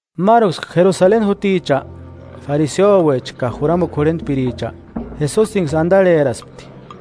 Máruksï Jerusaleni juticha, fariseuecha ka juramukua jurhentpiricha, Jesusiniksï andarheraspti.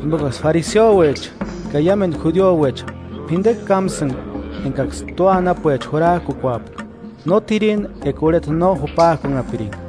(Jimbokaksï fariseuecha –ka iámendu judiouecha p'indekua kámsïnga engaksï tua anapuecha jurajkukuapka: No t'ireni eka urheta no jupajkunhapiringa.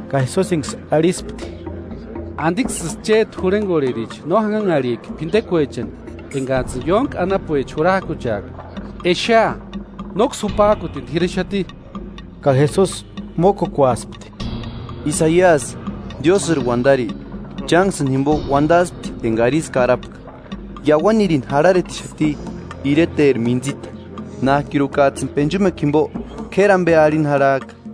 Ka Jesusiniksï arhispti: –¿Andiksïsï chéti jurhengorhericha no janhanharhijki p'indekuechani engajtsïni ióntki Tua anapuecha. anapuecha jurajkucheaka? Exea, nóksï jupajkutini t'irexati. Ka Jesusi mókukuaspti: –Isaiasï, Diósïri uandari, chánksïni jimbo uandaspti enga ísï karapka: Iauanirini jarharetixati ireteri mintsita. Nájkirukajtsïni penchumekua jimbo k'éri ambe arhini jarhajka.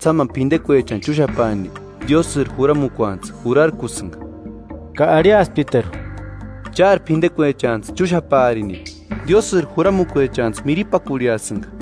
Ísïjtsï jámani p'indekuechani chúxapaani, Diósïri juramukuantsï jurarkusïnga. Ka arhiasptiteru: –Chári p'indekuechantsï chúxapaarini, Diósïri juramukuechantsï miripakurhiasïnga.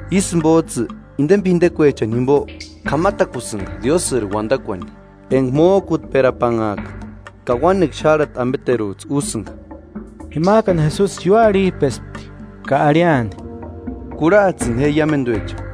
Ísï jimbojtsï, indeni p'idekuechani jimbo k'amatakusïnga Diósïri uandakuani, enga mójkutperapanhajka. Ka uánekua xárhati ambeterujtsï úsïnga. Jimajkani Jesusi ióarhijpespti, ka arhiani: –Kurhajtsïni je iámenduecha: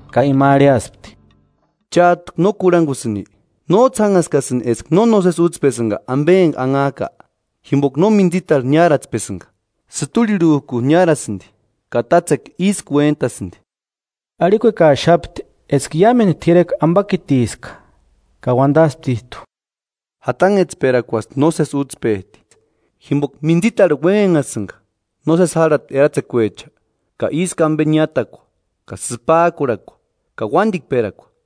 Ka ima arhiaspti: –¿Chájtu no kurhangusïnki? ¿Nójtsï jánhaskasïnki eska no nósesi útspesïnga ambe enga anhajka? Jimboka no mintsitarhu niáratspesïnga, sïturhirhujku niárasïndi ka tátsekua ísku uéntasïndi. Arhiakuekaxapti eska iámendu t'irekua ambakitiska. Ka uandasptijtu: –Jatanhetsperakuasï nósesi útspejti. Jimboka mintsitarhu uénhenhasïnga nósesi járhati eratsekuecha ka ísku ambe niátakua ka sïpajkurhakua ka uándikperakua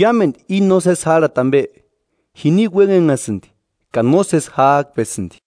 Iámendu i nósesi járhati ambe, jini uénhenhasïndi ka nósesi jájkpesïndi.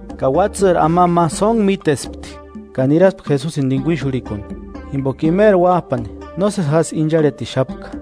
Ka uátsïri amamba ma sóntku mítespti ka niraspti Jesusini tinguixurhikuni, jimboka imeri uájpani nósesi jásï incharhetixapka.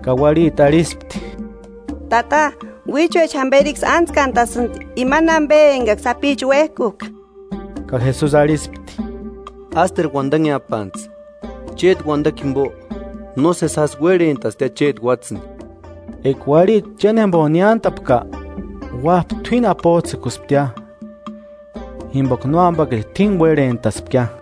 Ka uarhiti arhispti: –Tata, uíchuecha jamberiksï ántskantasïndi imani ambe engaksï sapicha uéjkujka. Ka Jesusi arhispti: –Ásteru uandanheapantsï, chéti uandakua jimbo, nósesi jásï uérhentastia chéti uátsïni. Eka uarhiti chénjembo niántapka, uájpa t'uíni apojtsïkusptia, jimboka nóambakiti t'uíni uérhentaspkia.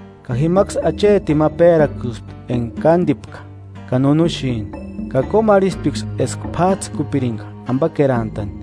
Ka jimaksï achetini ma pérakuspti enga kándipka ka nunuxini. Ka kómarhisptiksï eska p'ájtsïkupiringa ambakerantani.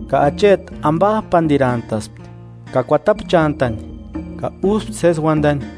Ka acheti ambajpandirantaspti, ka kuatapchantani, ka úspti sési uandani.